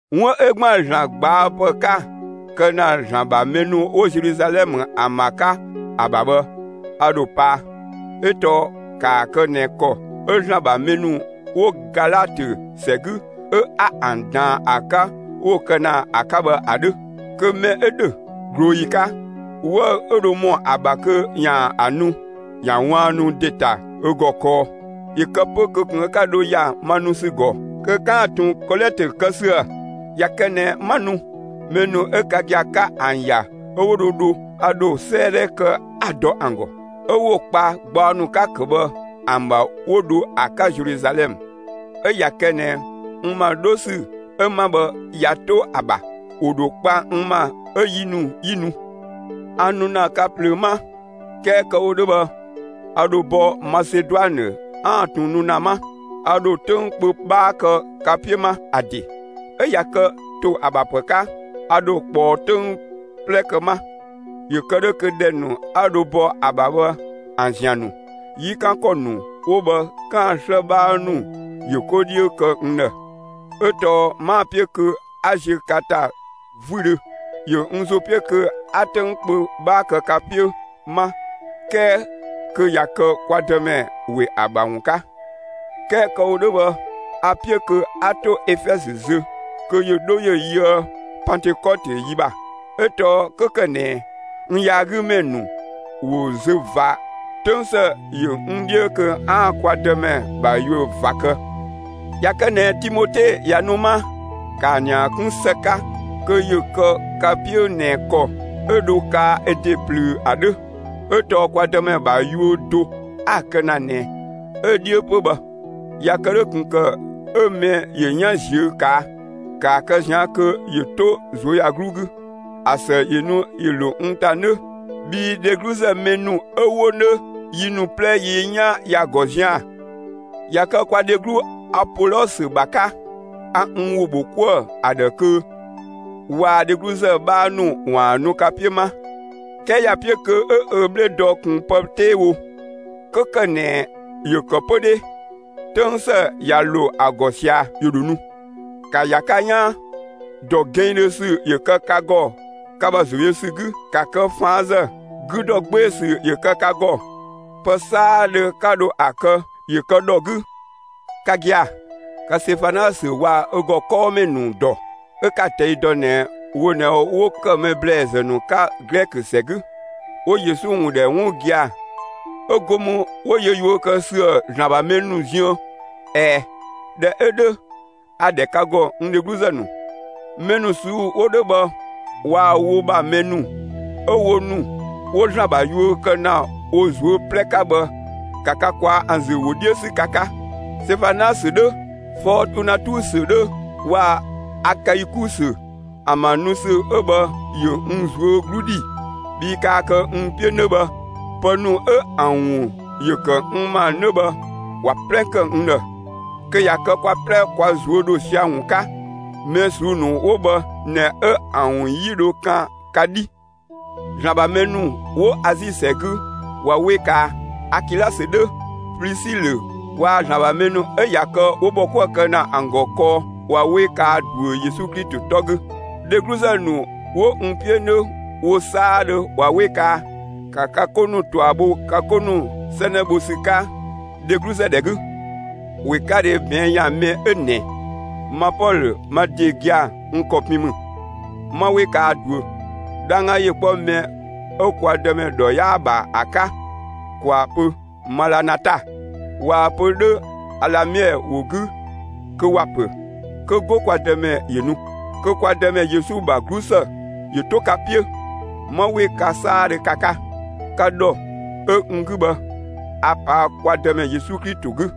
'Wun 'ö ‑gban ‑Zlan ꞊gbaapë 'ka‑ kë ‑na ‑Zlan ‑bha mɛ ‑nu 'wo Zeluzalɛmë ‑an ‑bha 'ka ‑a ‑bha bhë, a ‑dho paa; 'ö tɔɔ ‑kaa kë ꞊nɛ ‑kɔ 'ö ‑Zlan ‑bha mɛ ‑nu 'wo Galatö ‑sɛ 'gü 'a ‑an ꞊daan ‑a 'ka 'ö 'wo‑ kë ‑na ‑a 'ka bhë ‑a 'dhö. Kö mɛ 'ö ‑dhö, ꞊glooyi 'ka, 'wëü‑ 'ö dho ‑mɔ ‑a ‑bha kö ‑yaan ‑a nu, ꞊ya ꞊waannu ‑de ‑ta ö ‑gɔ kɔɔ, ‑yö kë 'pö kö ꞊kun 'ö 'ka dho ‑ya ma nu ‑sü ‑gɔ kö 'kaan‑ ꞊tun kɔlɛtö kë ‑süë! ꞊Ya kë ꞊nɛ 'ma nu, mɛ ‑nu 'ö ka gia‑ 'ka ‑an ‑ya 'ö 'wo dho dho, a ‑dho 'sëëdhɛ kë 'a‑ dɔ ‑an ‑gɔ, 'ö 'wo‑ kpa gbaɔ ‑nu 'ka‑ ‑kë bhë ‑an ‑bha 'ö 'wo dho ‑a 'ka Zeluzalɛmë. 'Ö ꞊ya kë ꞊nɛ n ‑ma 'dho ‑sü 'ö 'ma bhë, ꞊ya 'to ‑a ‑bha, ‑wo ‑dho kpa n ‑ma 'ö yi ‑nu, 'yi nu. A nu ‑na ka ꞊plöö 'ma. 'Kɛɛ kë‑ wo 'dhö bhë, a ‑dho bɔ Maseduanë 'aan‑ ꞊tun nu ‑na 'ma. A ‑dho 'töng kpö 'bhaa kë ka 'piö 'ma; ‑a ‑de 'ö ꞊ya kë ‑to ‑a ‑bha ‑pë 'ka, a ‑dho ꞊kpɔɔ 'töng 'plɛ kë 'ma, ‑yö kë 'dhö kö ‑dhɛ ‑nu 'a dho bɔ ‑a ‑bha bhë, ‑an ‑zian ‑nu, 'yi 'kan ‑kɔ ‑nu 'wo bhë 'kaan‑ 'slë 'bhaa ‑nu ‑yö 'ko 'dhiö kë n ‑dhë. 'Ö tɔɔ 'maa‑ 'piö kö 'a ziö ka ‑ta 'vüdhö. ‑Yö n ‑zo 'piö kö 'a 'töng kpö 'bhaa kë ka 'piö 'ma 'kɛɛ kö ꞊ya kë kwa Dëmɛ ‑we ‑a ‑bha ‑wun 'ka. 'Kɛɛ kë‑ wo 'dhö bhë, a‑ 'piö kö 'a 'to Efɛzö zö, kö ‑yö 'dho ‑yö yöë Pantëkɔtö yi ‑bha. 'Ö tɔɔ 'kö ‑kë ꞊nɛ n yaagümɛ ‑nu ‑wo zö ꞊va, 'töng ‑së ‑yö n 'dhiö kö 'aan‑ kwa Dëmɛ ‑bha yuö ꞊va kë. ꞊Ya kë ꞊nɛ Timote ꞊ya nu 'ma, ‑kaa ‑nia 'kun ‑së 'ka kö ‑yö kë ka 'piö ꞊nɛ ‑kɔ 'ö dho kaa ö ‑de plöö ‑a 'dhö; 'ö tɔɔ kwa Dëmɛ ‑bha yuö do 'a‑ kë ‑na ꞊nɛ, 'ö‑ 'dhiö 'pö bhë. ꞊Ya kë 'dhö, ꞊kun ‑kë 'ö mɛ ‑yö 'yan ꞊ziö' ꞊kaa'! ‑Kaa kë ꞊zian' kö ‑yö 'to ꞊zuöyagluu 'gü, ‑a ‑së ‑yö nu ‑yö ‑lo n ‑ta 'nö bhii dhegluzë mɛ ‑nu 'ö 'wo 'nö, yi ‑nu 'plɛ yi 'yan ‑ya ‑gɔ zian‑. ꞊Ya kë kwa dheglu Apolɔsö ‑bha 'ka, a n ‑wo ‑bho 'kuë‑ ‑a ‑dhë kö waa‑ dhegluzë 'bhaa ‑nu ‑waan nu ka 'piö 'ma; 'kɛɛ ‑ya 'piö kö 'ö ö 'bhle dɔ ꞊kun pë 'tee wo. 'Kö ‑kë ꞊nɛ ‑yö ‑kë 'pö 'dhe, 'töng ‑së ꞊ya ‑lo ‑a ‑gɔ ꞊sia, ‑yö ‑dho nu. ‑Ka ‑ya ka 'yaan; ‑dɔ gɛnngdhö ‑sü ‑yö kë ka ‑gɔ ka ‑bha ‑zo yö ‑sü 'gü; ‑ka kë ꞊faanzë; 'gü ‑dɔ 'gbee‑ ‑sü ‑yö kë ka ‑gɔ! Pë 'saadhö 'ka dho ‑a kë, ‑yö kë ‑dhɔ 'gü. Ka gia‑, ka Sefanasö waa‑ ö ‑gɔ 'kɔɔmɛ ‑nu ‑dɔ, 'ö 'ka‑ ꞊tɛi' dɔ ꞊nɛ wo ꞊nɛ 'wo ‑kë mɛ ‑blɛɛzë ‑nu 'ka Glɛkö ‑sɛ 'gü, 'wo Yesu ‑wun ‑dhɛ 'wun gia‑, 'ö go mü 'wo yö yuö kë ꞊süë' ‑Zlan ‑bha mɛ ‑nu ziën. ꞊Ɛɛ, ꞊dhɛ 'ö 'dhö, a‑ ‑dhɛ ka ‑gɔ, n dhegluzë ‑nu, mɛ ‑nu ꞊suu'‑ 'wo 'dhö bhë waa‑ wo ‑bha mɛ ‑nu 'ö wo ‑nu 'wo ‑Zlan ‑bha yuö kë ‑na wo ꞊zuö' 'plɛ 'ka bhë, ‑ka ka ꞊kwaa'‑ ‑an ‑zü ‑wo 'dhiö 'sü ka 'ka! Sɛfanasö 'dhö, Fɔɔtunatusö 'dhö waa‑ Akaikusö ‑an ‑bha nu ‑sü 'ö bhë ‑yö n ꞊zuö' 'glu ‑dhi bhii kaa kë n 'piö 'nö bhë, pë ‑nu 'ö ‑an ‑wun ‑yö ‑kë n ‑ma 'nö bhë, ꞊wa 'plɛ kë n ‑dhë; kö ꞊ya kë kwa 'plɛ kwa ꞊zuö' ‑dho sia‑ ‑wun 'ka. Mɛ ꞊suu'‑ ‑nu 'wo bhë ꞊nɛ 'ö ‑an ‑wun 'yi dho kan ka 'dhi. ‑Zlan ‑bha mɛ ‑nu 'wo Azi ‑sɛ 'gü ꞊wa 'we kaa! Akilasö 'dhö, Plisilö waa‑ ‑Zlan ‑bha mɛ ‑nu 'ö ꞊ya kë 'wo ‑bhɔ 'kuë‑ kë ‑na ‑an ‑gɔ kɔɔ ꞊wa 'we kaa ꞊duö Yesu Klito 'tɔ 'gü. Dhegluzë ‑nu 'wo n 'piö 'nö wo 'saadhö ꞊wa 'we kaa! ‑Ka ka 'ko ‑nu ꞊tua bho ka 'ko ‑nu 'sɛnɛ bho ‑sü 'ka dhegluzë ‑dhɛ 'gü. ꞊Wekadhe ꞊bɛɛn' ‑yan mɛ 'ö ꞊nɛ ma Pɔlö, ma ‑de gia‑ n ‑kɔ pin ‑mü: 'Ma 'we kaa ꞊duö! 'Dhangga ‑yö 'kpɔ mɛ 'ö kwa Dëmɛ ‑dhɔ 'yaa‑ ‑bha ‑a 'ka! ‑Kwaa pö: «Malanata!» (꞊Waa‑ pö 'dhö Alamiɛ ‑wo 'gü kö ‑wa ‑pö: «Kö 'go kwa Dëmɛ ‑yö nu!») Kö kwa Dëmɛ Yesu ‑bha 'glusë ‑yö 'to ka 'piö. ('Ma 'we ka 'saadhö ka 'ka,) ka ‑dhɔ 'ö n 'gü bhë ‑a ꞊paa' kwa Dëmɛ Yesu Klito 'gü.